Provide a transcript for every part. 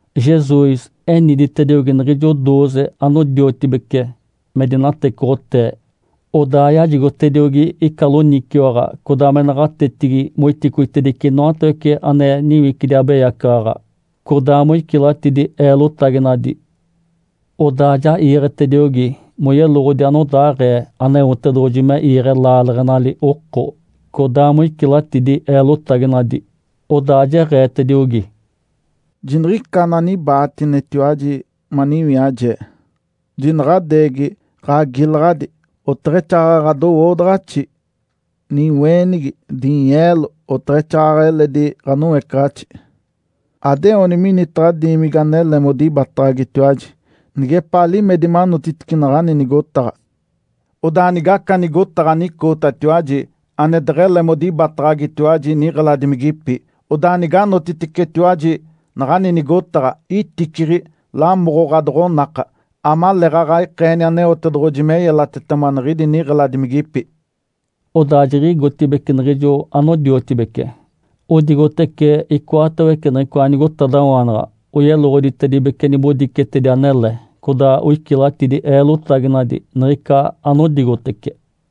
Jesus eniditediogi niɡ̶ijo dooze anodiotibece me dinatecoɡ̶otee, odaa yajigotediogi ica loniciwaɡ̶a codaa me naɡ̶atetigi moiticoitedice inoatawece ane niwicidi abeyacaɡ̶aɡ̶a, codaa moicilatidi eelotaginadi. Odaa ja iiɡ̶etediogi moyeloɡ̶odi anodaaɡ̶ee Aneotedoɡ̶oji me iiɡ̶e laaleɡ̶enali oko, codaa moicilatidi eelotaginadi. Odaa jeɡ̶eetediogi, “Jiniɡ̶ica ananibaatinetiwaji maniwiaje. Jinaɡ̶adeegi ɡ̶agiilaɡ̶adi, oteɡ̶exaaɡ̶aɡ̶a ɡ̶adowoodaɡ̶axi, niweenigi, dinyeelo, oteɡ̶exaaɡ̶aɡ̶a eledi ɡ̶anoecaɡ̶axi. Adeoni minitaɡ̶a diimigi anele modibataɡ̶agitiwaji, nigepaa limedi manotitice naɡ̶ani nigotaɡ̶a. Odaa nigaca nigotaɡ̶a anicootatiwaji ane deɡ̶ele modibataɡ̶agitiwaji niɡ̶eladimigipi, odaa niganotiticetiwaji naɡ̶ani nigotaɡ̶a, iticiɡ̶i lamoɡ̶o ɡ̶adoɡ̶onaka, amaleeɡ̶aɡ̶a ikeeni Aneotedoɡ̶oji me yelatetema niɡ̶idi niɡ̶eladimigipi.” Odaa jiɡ̶igotibeci niɡ̶ijo anodiotibece odigotece icoatawece niɡ̶icoa nigotadawaanaɡ̶a, oyeloɡ̶oditedibece nibodicetedi anele, codaa oicilatidi eelotaginadi niɡ̶ica anodigotece.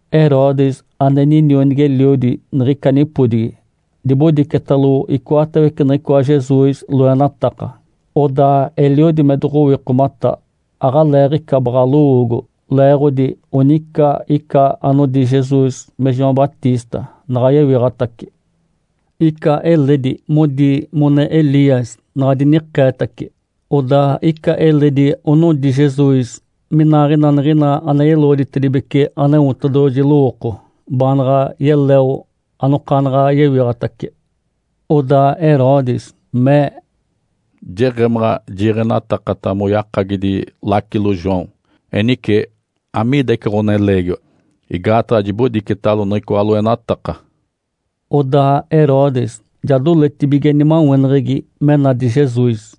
Herodes ane ninionigi-eliodi niɡ̶ica nipodigi dibodicetalo icoatawece niɡ̶icoa Jesus loenataka. Odaa eliodi me doɡ̶owikomata, aɡ̶aleeɡ̶ica baɡ̶a lowoogo, leeɡ̶odi onica ica anodi Jesus me João Batista naɡ̶a yewiɡ̶atace. Ica eledi modi mone Elias, naɡ̶a dinikeetaci, odaa ica eledi onodi Jesus minaaɡ̶ina niɡ̶ina ane yeloɡ̶oditedibece Aneotedoɡ̶oji lowooko, baanaɡ̶a yeleo anokaanaɡ̶a yewiɡ̶atace. Odaa Herodes mee, “Jeɡ̶emaɡ̶a jiiɡ̶enatakata moyakagidi lacilo João. Enice, amiida ica ɡ̶oneleegiwa? Igaataɡ̶a jibodicetalo niɡ̶icoa loenataka.” Odaa Herodes ja doletibige nimaweneɡ̶egi me nadi Jesus.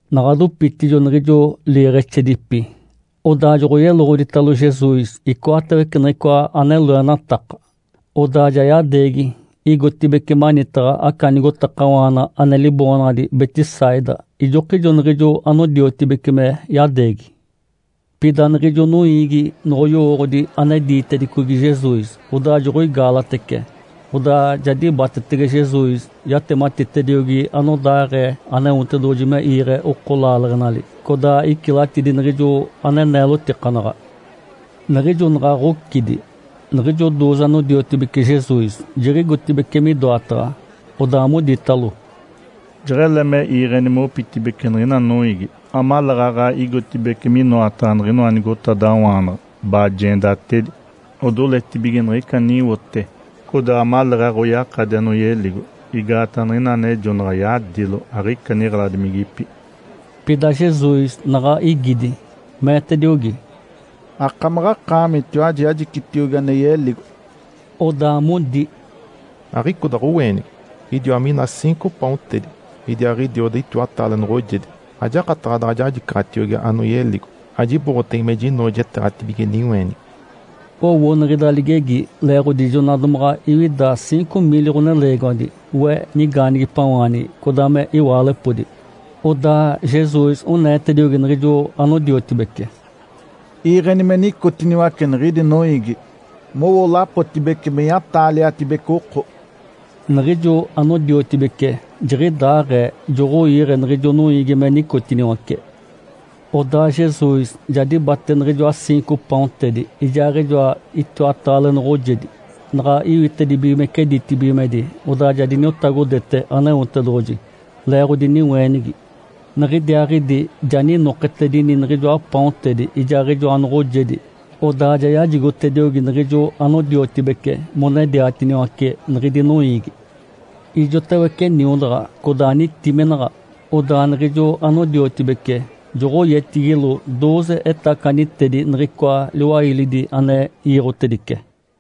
Naɡ̶a dopitijo niɡ̶ijo liiɡ̶exedipi, odaa joɡ̶oyeloɡ̶oditalo Jesus icoatawece niɡ̶icoa ane loenataka. Odaa ja yadeegi igotibeci manitaɡ̶a aca nigotakawaana ane liboonaɡ̶adi Betsaida, ijokijo niɡ̶ijo anodiotibece me yadeegi. Pida niɡ̶ijo noiigi noɡ̶oyowooɡ̶odi ane diitedicogi Jesus, odaa joɡ̶oigaalatece. Odaa ja dibatetege Jesus, yatematitediogi anodaaɡ̶ee Aneotedoɡ̶oji me iiɡ̶e oko laaleɡ̶enali, codaa icilatidi niɡ̶ijo ane neelotikanaɡ̶a. Niɡ̶ijo naɡ̶a ɡ̶ocidi, niɡ̶ijo dooze anodiotibece Jesus jiɡ̶igotibeci midoataɡ̶a, odaa moditalo, “Jeɡ̶ele me iiɡ̶eni mopitibeci niɡ̶ina noiigi, amaleeɡ̶aɡ̶a igotibeci minoataɡ̶a niɡ̶inoa nigotadawaanaɡ̶a, bajeendatedi, odoletibige niɡ̶ica aniwote, codaa amaleeɡ̶aɡ̶a oyakadi anoyeligo. Igaataɡ̶a niɡ̶ina anejonaɡ̶a yadilo, aɡ̶ica niɡ̶eladimigipi.” Pida Jesus naɡ̶a igidi, meetediogi, “Akamaɡ̶akaamitiwaji, ajicitiogi ane yeligo!” Odaa modi, “Aɡ̶icoda ɡ̶oweenigi, idiwa mina ciinco paontedi, idiaaɡ̶idioda itiwataale noɡ̶ojedi. Ajakataɡ̶a daɡ̶a jajicaɡ̶atiogi anoyeligo, ajiboɡ̶otege me jinoojeteeɡ̶atibige niweenigi.” Owo niɡ̶ida ligegi, leeɡ̶odi jona domaɡ̶a iwida ciinco miili ɡ̶oneleegiwadi (we nigaanigipawaanigi codaa me iwaalepodi). Odaa Jesus oneetediogi niɡ̶ijo anodiotibece, “Iiɡ̶eni me nicotiniwace niɡ̶idi noiigi, mowo lapotibece meya-taaliatibece oko.” Niɡ̶ijo anodiotibece jiɡ̶idaaɡ̶ee, joɡ̶oiiɡ̶e niɡ̶ijo noiigi me nicotiniwace. Odaa Jesus ja dibate niɡ̶ijoa ciinco paontedi ijaaɡ̶ijoa itiwataale noɡ̶ojedi. Naɡ̶a iwitedibigimece ditibigimedi, odaa ja diniotagodete Aneotedoɡ̶oji leeɡ̶odi niweenigi. Niɡ̶idiaaɡ̶idi ja ninoketedini niɡ̶ijoa paontedi, ijaaɡ̶ijoa noɡ̶ojedi. Odaa ja yajigotediogi niɡ̶ijo anodiotibece monediatiniwace niɡ̶idi noiigi. Ijotawece niodaɡ̶a, codaa nitiminaɡ̶a. Odaa niɡ̶ijo anodiotibece joɡ̶oyetigilo dooze etacanitedi niɡ̶icoa liwailidi ane iiɡ̶otedice.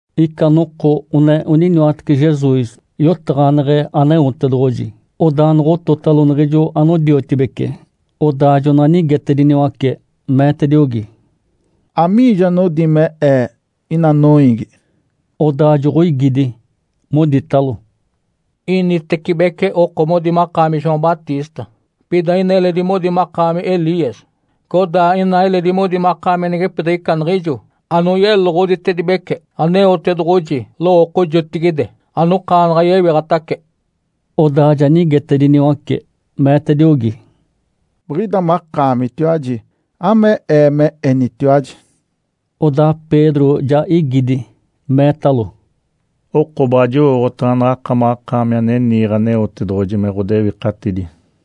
Ica noko one oniniwatece Jesus, yotaɡ̶aneɡ̶e Aneotedoɡ̶oji. Odaa jonoɡ̶ototalo niɡ̶ijo anodiotibece. Odaa jonaɡ̶a nigetediniwace, meetediogi, “Amiijo anodi me Ee, ina noiigi?” Odaa joɡ̶oigidi, moditalo, “Initecibece oko modi makaami João Batista. Pida ina eledi modi makaami Elias. Codaa ina eledi modi makaami anigepidiɡ̶ica niɡ̶ijo anoyeloɡ̶oditedibece Aneotedoɡ̶oji lowooko jotigide, anokaanaɡ̶a yewiɡ̶atace.” Odaa ja nigetediniwace, meetediogi, “Biɡ̶ida makaamitiwaji, ame Ee me enitiwaji?” Odaa Pedro ja igidi, meetalo, “Oko baɡ̶a jowooɡ̶otaɡ̶a naɡ̶akamaɡ̶akaami ane niiɡ̶e Aneotedoɡ̶oji me ɡ̶odewikatidi.”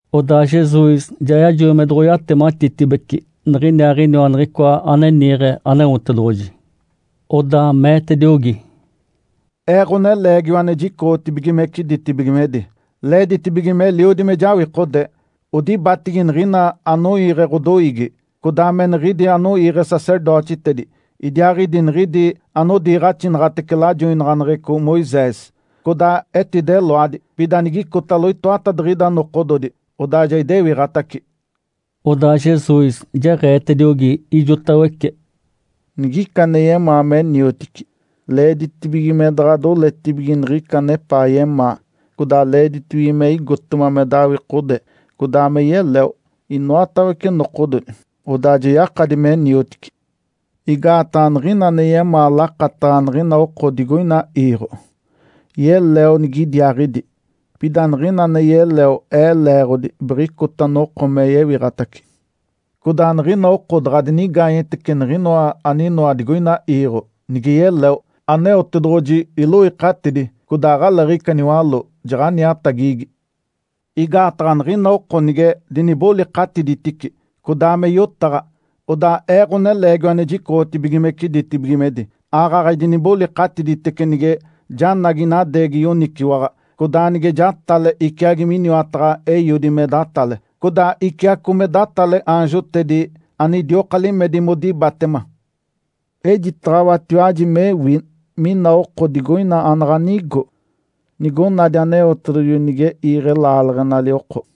Odaa Jesus ja yajoi me doɡ̶oyatematitibece niɡ̶iniaaɡ̶iniwa Niɡ̶icoa ane niiɡ̶e Aneotedoɡ̶oji. Odaa meetediogi, “Ee, Ǥoneleegiwa ane jicoɡ̶otibigimece ditibigimedi, leeditibige meliodi me jawikode. Odibatigi, niɡ̶ina anoiiɡ̶e ɡ̶odoiigi, codaa me niɡ̶idi anoiiɡ̶e sacerdotitedi, idiaaɡ̶idi niɡ̶idi anodiiɡ̶axinaɡ̶atece lajoinaɡ̶aneɡ̶eco Moisés. Codaa etideloadi, pida nigicotalo itoatadiɡ̶ida nokododi, odaa ja idewiɡ̶atace.” Odaa Jesus jeɡ̶eetediogi ijotawece, “Nigica ane yemaa me niotici, leeditibige me daɡ̶a doletibige niɡ̶ica anepaa yemaa, codaa leeditibige me igotema me dawikode codaa me yeleo, inoatawece nokododi. Odaa ja yakadi me niotici. Igaataɡ̶a niɡ̶ina ane yemaa lakataɡ̶a niɡ̶ina oko digoina iiɡ̶o, yeleo nigidiaaɡ̶idi. Pida niɡ̶ina ane yeleo Ee leeɡ̶odi, biɡ̶icota noko me yewiɡ̶atace. Codaa niɡ̶ina oko daɡ̶a dinigaanyetece niɡ̶inoa aninoa digoina iiɡ̶o, nige yeleo, Aneotedoɡ̶oji iloikatidi, codaa aɡ̶aleeɡ̶ica niwaló, jaɡ̶aniatagigi. Igaataɡ̶a niɡ̶ina oko nige dinibolikatiditici, codaa me yotaɡ̶a, odaa Ee, Ǥoneleegiwa ane jicoɡ̶otibigimece ditibigimedi, aaɡ̶aɡ̶a idinibolikatiditece nige janagi inadeegi yoniciwaɡ̶a, codaa nige jatale iciagi miniwataɡ̶a Eiodi me datale, codaa iciaco me datale aanjotedi ane idioka limedi modibatema. Ejitaɡ̶awatiwaji mewi mina oko digoina anaɡ̶a nigo, nigonadi Aneotedoɡ̶oji nige iiɡ̶e laaleɡ̶enali oko.”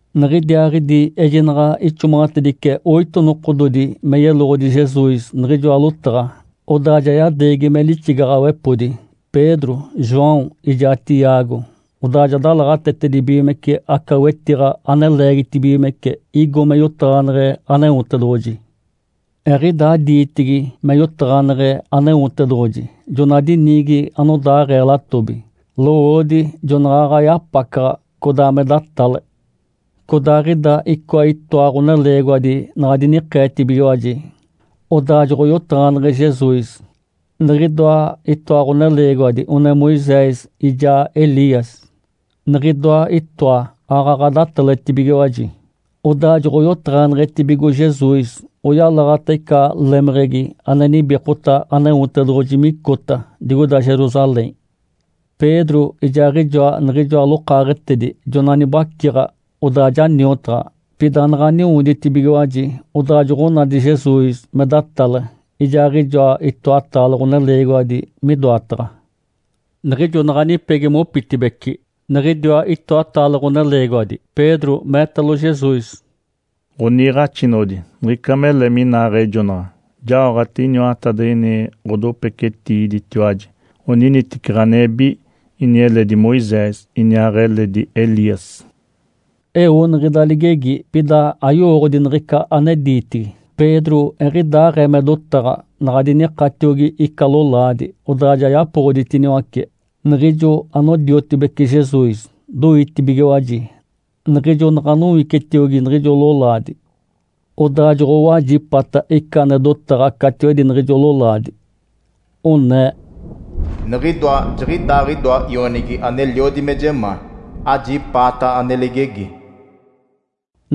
Niɡ̶idiaaɡ̶idi ejinaɡ̶a ixomaɡ̶atedice oito nokododi me yeloɡ̶odi Jesus niɡ̶ijoa lotaɡ̶a, odaa ja yadeegi me lixigaɡ̶awepodi Pedro, João, ijaa Tiago. Odaa ja dalaɡ̶atetedibigimece aca wetiɡ̶a ane leegitibigimece, igo me yotaɡ̶aneɡ̶e Aneotedoɡ̶oji. Eɡ̶idaa diitigi me yotaɡ̶aneɡ̶e Aneotedoɡ̶oji jona diniigi anodaaɡ̶ee latobi, lowoodi jonaɡ̶aɡ̶a yapacaɡ̶a, codaa me datale. Codaaɡ̶ida icoa itoa ɡ̶oneleegiwadi naɡ̶a dinikeetibigiwaji, odaa joɡ̶oyotaɡ̶aneɡ̶e Jesus. Niɡ̶idoa itoa ɡ̶oneleegiwadi one Moisés, ijaa Elias. Niɡ̶idoa itoa aaɡ̶aɡ̶a dataletibigiwaji. Odaa joɡ̶oyotaɡ̶aneɡ̶etibigo Jesus, oyalaɡ̶ata ica lemeɡ̶egi ane nibikota Aneotedoɡ̶oji micota digoida Jerusalém. Pedro ijaaɡ̶ijoa niɡ̶ijoa lokaaɡ̶etedi jonaɡ̶a nibaciɡ̶a, odaa ja niotaɡ̶a. Pida naɡ̶a niwoditibigiwaji, odaa joɡ̶onadi Jesus me datale, ijaaɡ̶ijoa itoataale ɡ̶oneleegiwadi midoataɡ̶a. Niɡ̶ijo naɡ̶a nipegi mopitibeci niɡ̶idiwa itoataale ɡ̶oneleegiwadi, Pedro meetalo Jesus, “Ǥoniiɡ̶axinoɡ̶odi, niɡ̶ica mele minaaɡ̶ejonaɡ̶a! Jaoɡ̶ate iniwatadiɡ̶ini ɡ̶adopecetiiditiwaji, oniniteci ɡ̶anebi, ini eledi Moisés, iniaaɡ̶eledi Elias.” Eo niɡ̶ida ligegi, pida ayowooɡ̶odi niɡ̶ica ane diitigi. Pedro eɡ̶idaaɡ̶ee me dotaɡ̶a, naɡ̶a dinikatiogi ica lolaadi, odaa ja yapoɡ̶oditiniwace. Niɡ̶ijo anodiotibece Jesus doitibigiwaji niɡ̶ijo naɡ̶a nowicetiogi niɡ̶ijo lolaadi. Odaa joɡ̶owajipata ica ane dotaɡ̶a catiwedi niɡ̶ijo lolaadi, onee, “Niɡ̶idoa, jiɡ̶idaaɡ̶idoa Ionigi aneliodi me jemaa. Ajipaata ane ligegi!”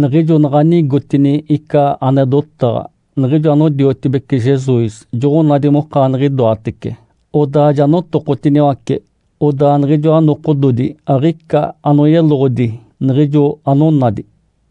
Niɡ̶ijo naɡ̶a nigotini ica ane dotaɡ̶a, niɡ̶ijo anodiotibece Jesus joɡ̶onadi mokaaniɡ̶idoatece. Odaa ja notokotiniwace, odaa niɡ̶ijoa nokododi aɡ̶ica anoyeloɡ̶odi niɡ̶ijo anonadi.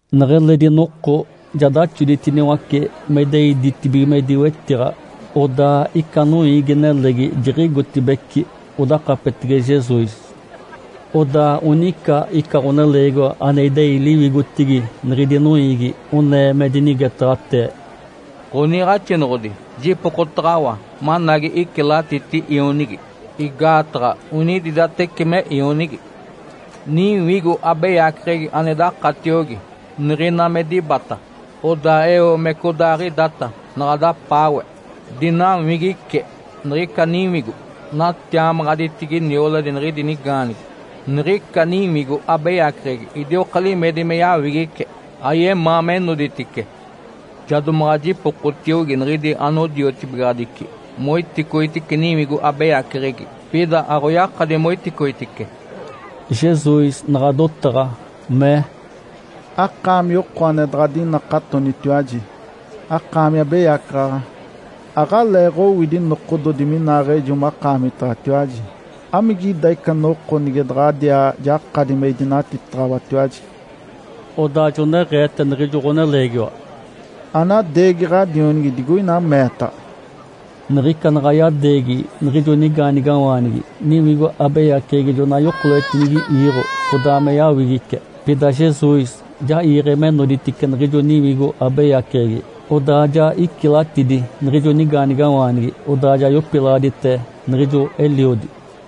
Neɡ̶eledi noko ja daxoditiniwace me idei ditibigimedi wetiɡ̶a. Odaa ica noiigi-nelegi jiɡ̶igotibeci odakapetege Jesus. Odaa onica ica ɡ̶oneleegiwa ane idei liwigotigi niɡ̶idi noiigi, onee me dinigetaɡ̶atee, “Ǥoniiɡ̶axinoɡ̶odi, jipokotaɡ̶awa managi icilatiti ionigi, igaataɡ̶a onididateci me ionigi. Niwigo abeyaceɡ̶egi ane dakatiogi, niɡ̶ina me dibata, odaa eo me codaaɡ̶idata naɡ̶a dapaawe, dinawigice niɡ̶ica niwigo, natiamaɡ̶aditigi nioladi niɡ̶idi nigaanigi. Niɡ̶ica niwigo abeyaceɡ̶egi idioka limedi me yawigice, ayemaa me noditice. Ja domaɡ̶a jipokotiogi niɡ̶idi anodiotibigaɡ̶adici moiticoitice niwigo abeyaceɡ̶egi, pida aɡ̶oyakadi moiticoitice.” Jesus naɡ̶a dotaɡ̶a, mee, “Akaami oko ane daɡ̶a adinakatonitiwaji, akaami abeyacaɡ̶aɡ̶a. Aɡ̶aleeɡ̶owidi nokododi minaaɡ̶ejo makaamitaɡ̶atiwaji. Amigida ica noko nige daɡ̶adiaa jakadi me idinatitaɡ̶awatiwaji?” Odaa joneɡ̶eete niɡ̶ijo ɡ̶oneleegiwa, “Anadeegi ɡ̶adionigi digoina meetaɡ̶a!” Niɡ̶ica naɡ̶a yadeegi niɡ̶ijo nigaanigawaanigi, niwigo abeyaceɡ̶egi jona yokoletinigi iiɡ̶o, codaa me yawigice. Pida Jesus ja iiɡ̶e me noditice niɡ̶ijo niwigo abeyaceɡ̶egi, odaa ja icilatidi niɡ̶ijo nigaanigawaanigi. Odaa ja yopilaɡ̶adite niɡ̶ijo eliodi.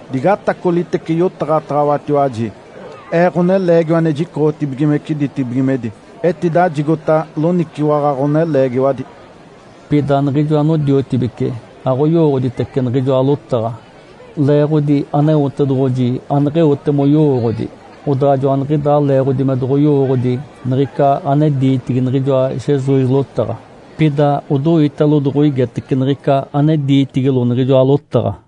“Digatacolitece yotaɡ̶ataɡ̶awatiwaji. Ee, Ǥoneleegiwa ane jicoɡ̶otibigimece ditibigimedi, etidajigota loniciwaɡ̶a ɡ̶oneleegiwadi.” Pida niɡ̶ijo anodiotibece aɡ̶oyowooɡ̶oditece niɡ̶ijoa lotaɡ̶a, leeɡ̶odi Aneotedoɡ̶oji aneɡ̶eote moyowooɡ̶odi. Odaa joaniɡ̶idaa leeɡ̶odi me doɡ̶oyowooɡ̶odi niɡ̶ica ane diitigi niɡ̶ijoa Jesus lotaɡ̶a. Pida odoitalo doɡ̶oigetece niɡ̶ica ane diitigilo niɡ̶ijoa lotaɡ̶a.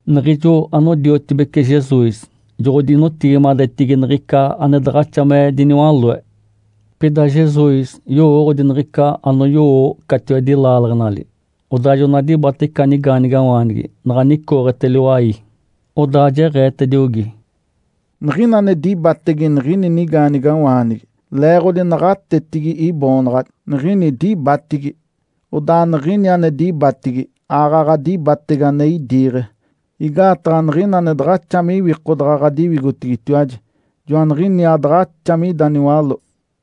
Niɡ̶ijo anodiotibece Jesus jonoɡ̶odinotigimadetigi niɡ̶ica ane daɡ̶axa me diniwaloe. Pida Jesus yowooɡ̶odi niɡ̶ica anoyowo catiwedi laaleɡ̶enali. Odaa jona dibate ica nigaanigawaanigi. Naɡ̶a nicooɡ̶ete liwai, Odaa jeɡ̶eetediogi, “Niɡ̶ina ane dibatege niɡ̶ini nigaanigawaanigi, leeɡ̶odi naɡ̶atetigi Iboonaɡ̶adi, niɡ̶ini dibatigi. Odaa niɡ̶ini ane dibatigi, aaɡ̶aɡ̶a dibatege ane idiiɡ̶e. Igaataɡ̶a niɡ̶ina ane daɡ̶axa me iwikodaɡ̶a ɡ̶adiwigotigitiwaji, joaniɡ̶iniaa daɡ̶axa mida niwaló.”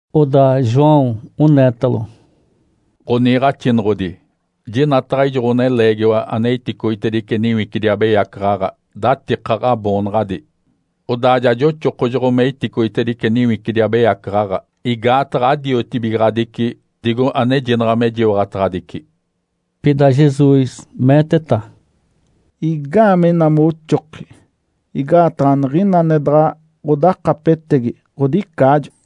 Odaa João oneetalo, “Ǥoniiɡ̶axinoɡ̶odi, jinataɡ̶a ijo ɡ̶oneleegiwa ane iticoitedice niwicidi abeyacaɡ̶aɡ̶a datika Ǥaboonaɡ̶adi. Odaa ja joxokojoɡ̶o me iticoitedice niwicidi abeyacaɡ̶aɡ̶a, igaataɡ̶a adiotibigaɡ̶adici digo anejinaɡ̶a me jiwaɡ̶ataɡ̶adici.” Pida Jesus meeteta, “Igaamee ina moxoki? Igaataɡ̶a niɡ̶ina ane daɡ̶a ɡ̶odakapetegi, ɡ̶odicaajo.”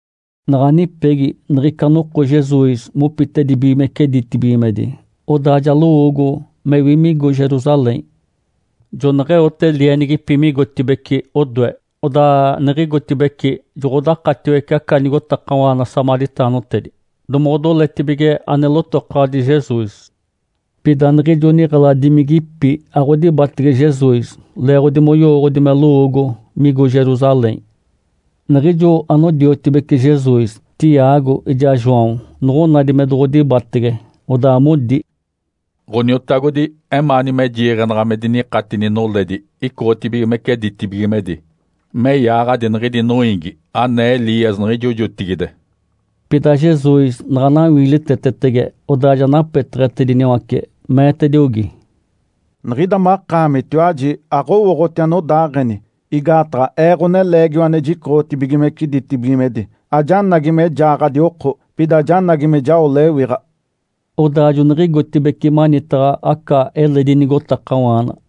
Naɡ̶a nipegi niɡ̶ica noko Jesus mopitedibigimece ditibigimedi, odaa ja lowoogo mewi migo Jerusalém. Joneɡ̶eote lienigipi migotibeci odoe. Odaa niɡ̶igotibeci joɡ̶odakatiwece aca nigotakawaana samaritaanotedi, domoɡ̶odoletibige ane lotokaɡ̶adi Jesus. Pida niɡ̶ijo niɡ̶eladimigipi aɡ̶odibatege Jesus, leeɡ̶odi moyowooɡ̶odi me lowoogo migo Jerusalém. Niɡ̶ijo anodiotibece Jesus, Tiago ijaa João noɡ̶onadi me doɡ̶odibatege, odaa modi, “Ǥoniotagodi, emaani me jiiɡ̶enaɡ̶a me dinikatini noledi icoɡ̶otibigimece ditibigimedi me yaaɡ̶adi niɡ̶idi noiigi, anee Elias niɡ̶ijo jotigide?” Pida Jesus naɡ̶a nawiilitetege, odaa ja napeteɡ̶etediniwace, meetediogi, “Niɡ̶ida makaamitiwaji aɡ̶owooɡ̶oti anodaaɡ̶eni. Igaataɡ̶a Ee, Ǥoneleegiwa ane jicoɡ̶otibigimece ditibigimedi, ajanagi me jaaɡ̶adi oko, pida janagi me jao lewiɡ̶a.” Odaa joniɡ̶igotibeci manitaɡ̶a aca eledi nigotakawaana.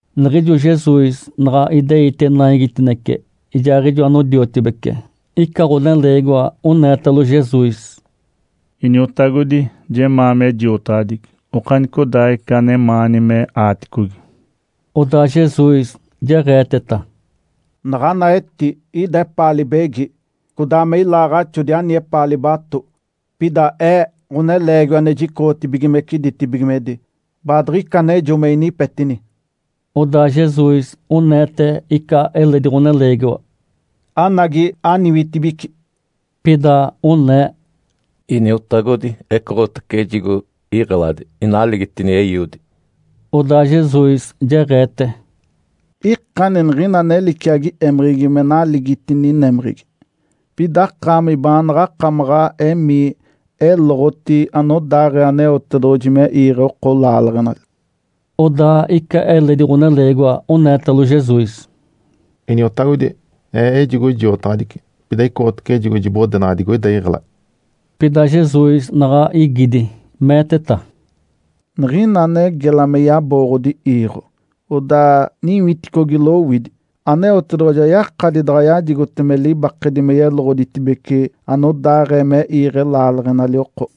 Niɡ̶ijo Jesus naɡ̶a ideite naigitinece ijaaɡ̶ijo anodiotibece, ica ɡ̶oneleegiwa oneetalo Jesus, “Iniotagodi, jemaa me jiotaɡ̶adici okanicodaaɡ̶ica anemaani me aaticogi.” Odaa Jesus jeɡ̶eeteta, “Naɡ̶ana eti ida epaa libegi, codaa me ilaaɡ̶axodi ani epaa libato. Pida Ee, Ǥoneleegiwa ane jicoɡ̶otibigimece ditibigimedi, baadiɡ̶icanejo me inipetini.” Odaa Jesus oneete ica eledi ɡ̶oneleegiwa, “Anagi aniwitibici!” Pida onee, “Iniotagodi, ecoɡ̶otace ejigo iɡ̶eladi, inaligitini eiodi.” Odaa Jesus jeɡ̶eete, “Ikani niɡ̶ina ane liciagi émeɡ̶egi me naligitini némeɡ̶egi. Pida akaami baanaɡ̶a akamaɡ̶a emii, eloɡ̶oti anodaaɡ̶ee Aneotedoɡ̶oji me iiɡ̶e oko laaleɡ̶enali.” Odaa ica eledi ɡ̶oneleegiwa oneetalo Jesus, “Iniotagodi, ee ejigo jiotaɡ̶adici, pida ecoɡ̶otace ejigo jibodenaɡ̶a digoida iɡ̶eladi.” Pida Jesus naɡ̶a igidi meeteta, “Niɡ̶ina ane gela me yabooɡ̶odi iiɡ̶o, odaa niwiticogi lowidi, Aneotedoɡ̶oji ayakadi daɡ̶a yajigote me libakedi me yeloɡ̶oditibece anodaaɡ̶ee me iiɡ̶e laaleɡ̶enali oko.”